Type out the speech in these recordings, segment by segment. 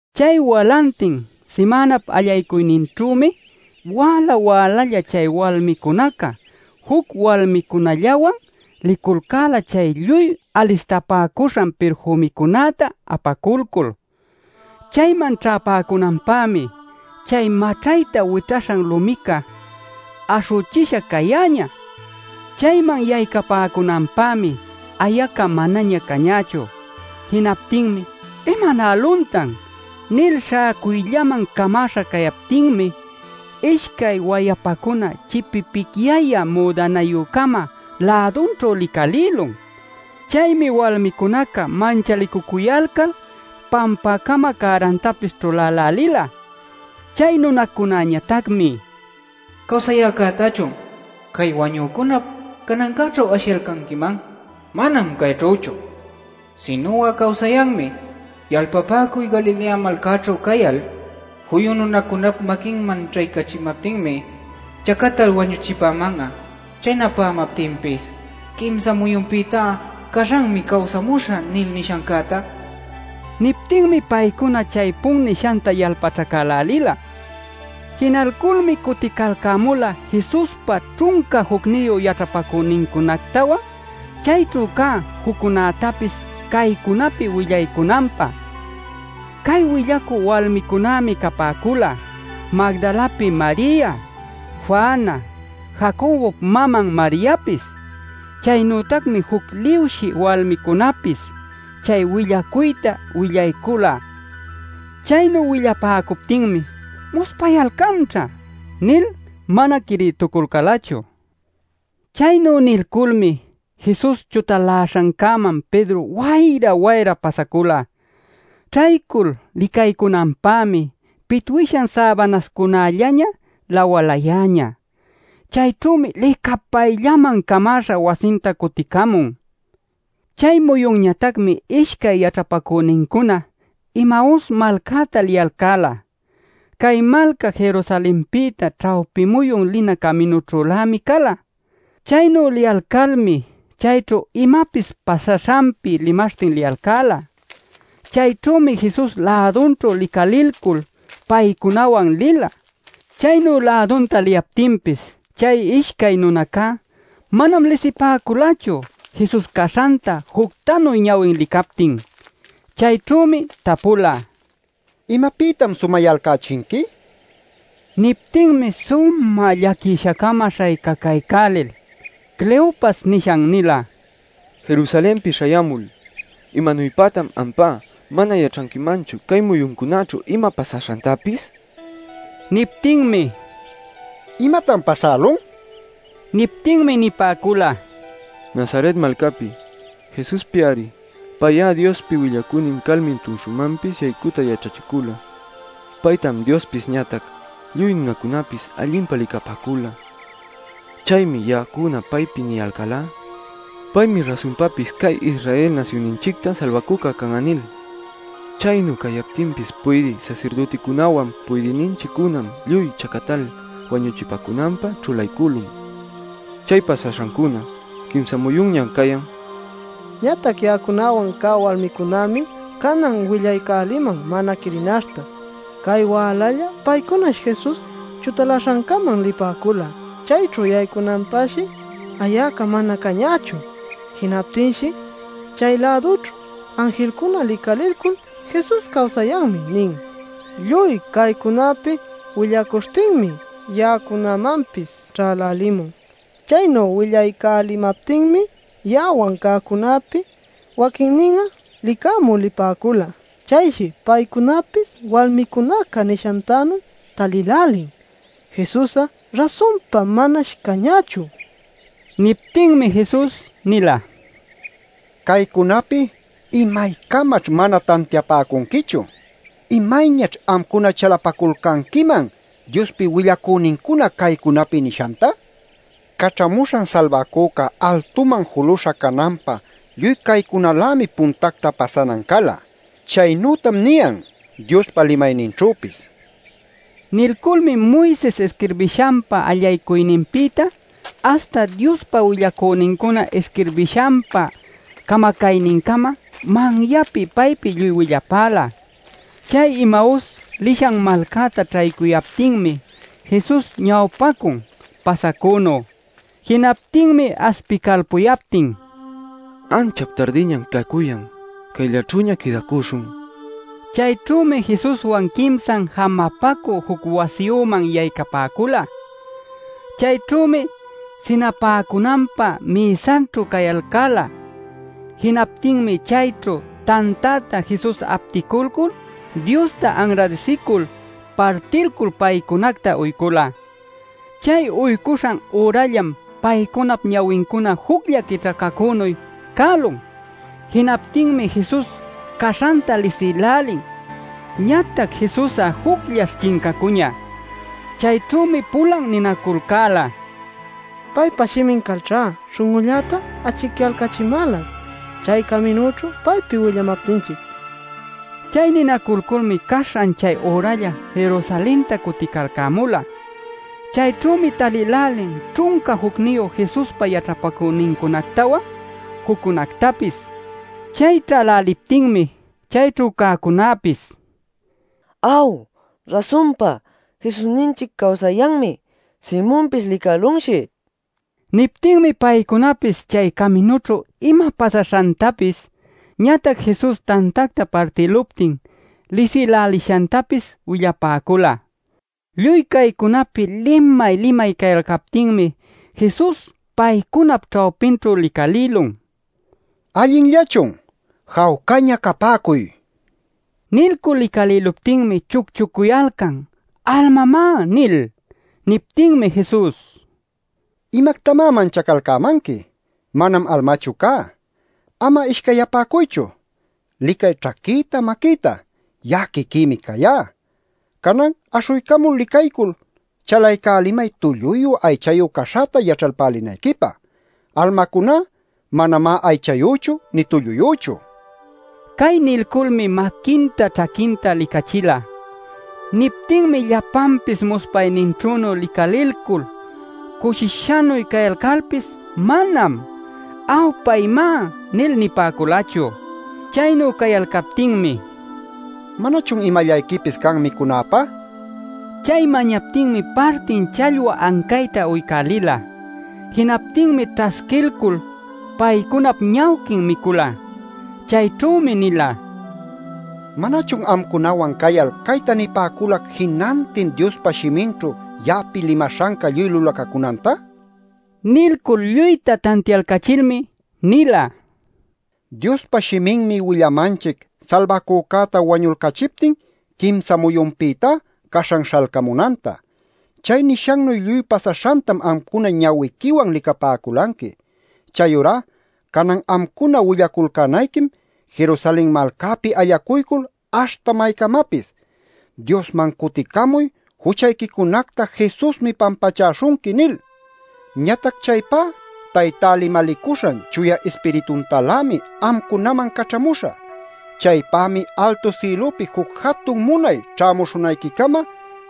Chay walantin simänap allaycuyninćhümi wäla-wälalla chay walmicunaca juc walmicunallawan liculcäla chay lluy alistapäcuśhan pirfümicunäta apaculcul. Chayman ćhäpäcunanpämi chay maćhayta wićhaśhan lumica aśhüchisha cayäñä. Chayman yaycapäcunanpämi ayaca manaña cañächu. Jinaptinmi “¿Imanäluntan?” nil śhäcuyllaman camäśha cayalcaptin ishcay wayapacuna chipipicyayä müdanayü-cama lädunćhu licalïlun. Chaymi walmicunaca manchalicucuyalcal pampäcama cärantapis ćhulälälila. Chay nunacunäñatacmi: “¿Cawsayäcätachun cay wañücunap canancäćhu ashiyalcanquiman? Manam cayćhüchu, sinu'a cawsayanmi. Yalpapäcuy Galilea malcäćhu cayal: ‘Juyu nunacunap maquinman ćhaycachimaptinmi chacatal wañuchipäman'a. Chaynapämaptinpis quimsa muyunpïtá caśhanmi cawsamuśhä’ nil nishancäta” nin. Niptinmi paycuna chaypun nishanta yalpaćhacälälila. Jinalculmi cuticalcämula Jesuspa ćhunca jucniyu yaćhapacünincunactawan chayćhu cä juccunätapis caycunapi willaycunanpä. (Cay willacü walmicunämi capäcula Magdalapi Maria, Juana, Jacobop maman Mariapis. Chaynütacmi juc liwshï walmicunäpis chay willacuyta willaycula.) Chaynu willapäcuptinmi “Muspayalcanćha” nil mana quirïtuculcälachu. Chaynu nilculmi Jesus chutaläśhancäman Pedro wayra-wayra pasacula. Ćhaycul licaycunanpämi pitwishan säbanacunallanña lawalayäñä. Chayćhümi licapayllaman camäśha wasinta cuticamun. Chay muyunñatacmi ishcay yaćhapacünincuna Emaus malcäta liyalcäla. (Cay malca Jerusalenpïta ćhawpi muyun lina caminućhülämi cala.) Chaynu liyalcalmi chayćhu imapis pasaśhanpi limaśhtin liyalcäla. Chayćhümi Jesus lädunćhu licalilcul paycunawan lila. Chaynu lädunta liyaptinpis chay ishcay nunacá manam lisipäculachu Jesus caśhanta juctanu ñawin licaptin. Chayćhümi tapula: “¿Imapïtam sumayalcächinqui?” nil. Niptinmi sumä llaquisha-cama śhaycacaycälil Cleopas nishan nila: “Jerusalenpi śhayämul ¿imanuypatan ampá mana yaćhanquimanchu cay muyuncunaćhu ima pasaśhantapis?” nil. Niptinmi: “¿Imatan pasälun?” nila. Niptinmi nipäcula: “Nazaret malcäpi Jesuspi-ari. Pay'a Diospi willacünin calmi tumshumanpis yaycüta yaćhachicula. Paytam Diospis ñatac lluy nunacunapis allinpa licapäcula. Chaymi ya'acuna paypi niyalcälá: ‘Paymi rasunpapis cay Israel nasyunninchicta Salbacüca can'a’ nil. Chaynu cayaptinpis puydï sasirdüticunäwan puydïninchiccunam lluy chacatal wañuchipäcunanpä ćhulaycülun. Chay pasaśhancuna quimsa muyunñam cayan. Ñatac ya'acunawan cä walmicunämi canan willaycäliman mana quirinaśhta. Cay wälalla paycunash Jesus chutaläśhancäman lipäcula. Chayćhu yaycunanpäshi ayaca mana cañächu. Jinaptinshi chay-lädunćhu anjilcuna licalilcul ‘Jesus cawsayanmi’ nin. Lluy caycunapi willacuśhtinmi ya'acunamanpis ćhälälimun. Chaynu willaycälimaptinmi ya'awan cäcunäpi waquinnin'a licamü lipäcula. Chayshi paycunapis walmicunaca nishantanuy talïlälin. Jesus'a rasunpa manash cañächu” nipäcula. Niptinmi Jesus nila: “Caycunapi ¿imaycamaćh mana tantiapäcunquichu? ¿Imayñaćh amcuna chalapaculcanquiman Diospi willacünincuna caycunapi nishanta? Caćhamuśhan Salbacüca altuman juluśha cananpä lluy caycunalämi puntacta pasanan cala. Chaynütam niyan Diospa limayninćhüpis” nila. Nilculmi Moises isquirbishanpa allaycuyninpïta aśhta Diospa willacünincuna isquirbishanpa camacaynincama manyapi paypi lluy willapäla. Chay Emaus lishan malcäta ćhaycuyaptinmi Jesus ñawpacun pasacünu. Jinaptinmi aspicalpuyaptin: “Anchap tardiñam cacuyan. Cayllaćhüña quïdacuśhun” nipäcula. Chayćhümi Jesuswan quimsan jamapacü juc wasiyüman yaycapäcula. Chayćhümi sinapäcunanpä mïsaćhu cayalcäla. Jinaptinmi chayćhu tantäta Jesus apticulcul Diosta anradisicuycul partilcul paycunacta uycula. Chay uycuśhan ürallam paycunap ñawincuna juclla quićhacacünuy cälun. Jinaptinmi Jesus caśhanta lisïlälin, ñatac Jesus'a jucllash chincacuñä. Chayćhümi pulan ninaculcäla: “Paypa shimin calćhá śhun'ulläta achicyalcachimäla chay caminüćhu paypi willamaptinchic” nil. Chay ninaculculmi caśhan chay üralla Jerusalenta cuticalcämula. Chayćhümi talïlälin ćhunca jucniyu Jesuspa yaćhapacünincunactawan juccunactapis. Chay ćhäläliptinmi chayćhu cäcunäpis: “Aw, rasunpa Jesusninchic cawsayanmi. Simonpis licälunshi” nipäcula. Niptinmi paycunapis chay caminućhu ima pasaśhantapis, ñatac Jesus tantacta partïluptin lisïlälishantapis willapäcula. Lluy caycunapi limay-limay cayalcaptinmi Jesus paycunap ćhawpinćhu licalïlun: “¿Allinllachun? Jawcaña capäcuy” nil. Nilcul licalïluptinmi chucchucuyalcan “¡Almamá!” nil. Niptinmi Jesus: “¿Imactamá manchacalcämanqui? Manam almachu cá. Ama ishcayyapäcuychu. Licay ćhaquïta maquïta. Ya'a quiquïmi cayá. Canan aśhuycamul licaycul chalaycälimay tulluyu aychayu caśhäta yaćhalpälinayquipä. Almacuná manamá aychayüchu nï tulluyüchu” nila. Cay nilculmi maquinta ćhaquinta licachila. Niptinmi llapanpis muspayninćhünu licalilcul cushishanuy cayalcalpis manam “Aw, paymá” nil nipäculachu. Chaynu cayalcaptinmi “¿Manachun imallayquipis can micunäpä?” nila. Chay mañaptinmi partin challwa ancayta uycälila. Jinaptinmi ćhasquilcul paycunap ñawquin micula. Chayćhümi nila: “¿Manachun amcunawan cayal cayta nipäculac jinantin Diospa shiminćhu ya'api limaśhanca lluy lulacacunanta?” nil. Nilcul lluyta tantialcachilmi nila: “Diospa shiminmi willamanchic Salbacücäta wañulcachiptin quimsa muyunpïtá caśhan śhalcamunanta. Chay nishannuy lluy pasaśhantam amcuna ñawiquiwan licapäculanqui. Chayurá canan amcuna willaculcänayquim Jerusalen malcäpi allacuycul aśhta maycamapis: ‘Diosman cuticamuy. Juchayquicunacta Jesusmi pampachaśhunqui’ nil. Ñatac chaypá Taytá limalicuśhan Chuya Ispirituntalämi amcunaman caćhamuśhä. Chaypämi altu sïlupi juc jatun munay ćhämuśhunayquicama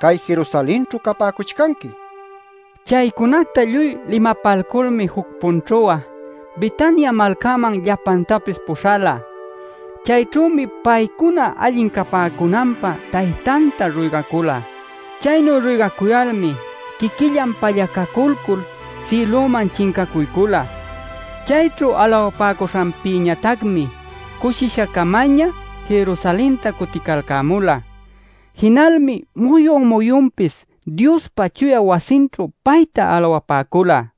cay Jerusalenćhu capäcuchcanqui” nila. Chaycunacta lluy limapalculmi juc-punćhu'a Betania malcäman llapantapis puśhala. Chayćhümi paycuna allin capäcunanpä Taytanta ruygacula. Chaynu ruygacuyalmi quiquillan pallacaculcul sïlüman chincacuycula. Chayćhu alawapäcuśhanpïñatacmi cushisha-camaña Jerusalenta cuticalcämula. Jinalmi muyun-muyunpis Diospa chuya wasinćhu payta alawapäcula.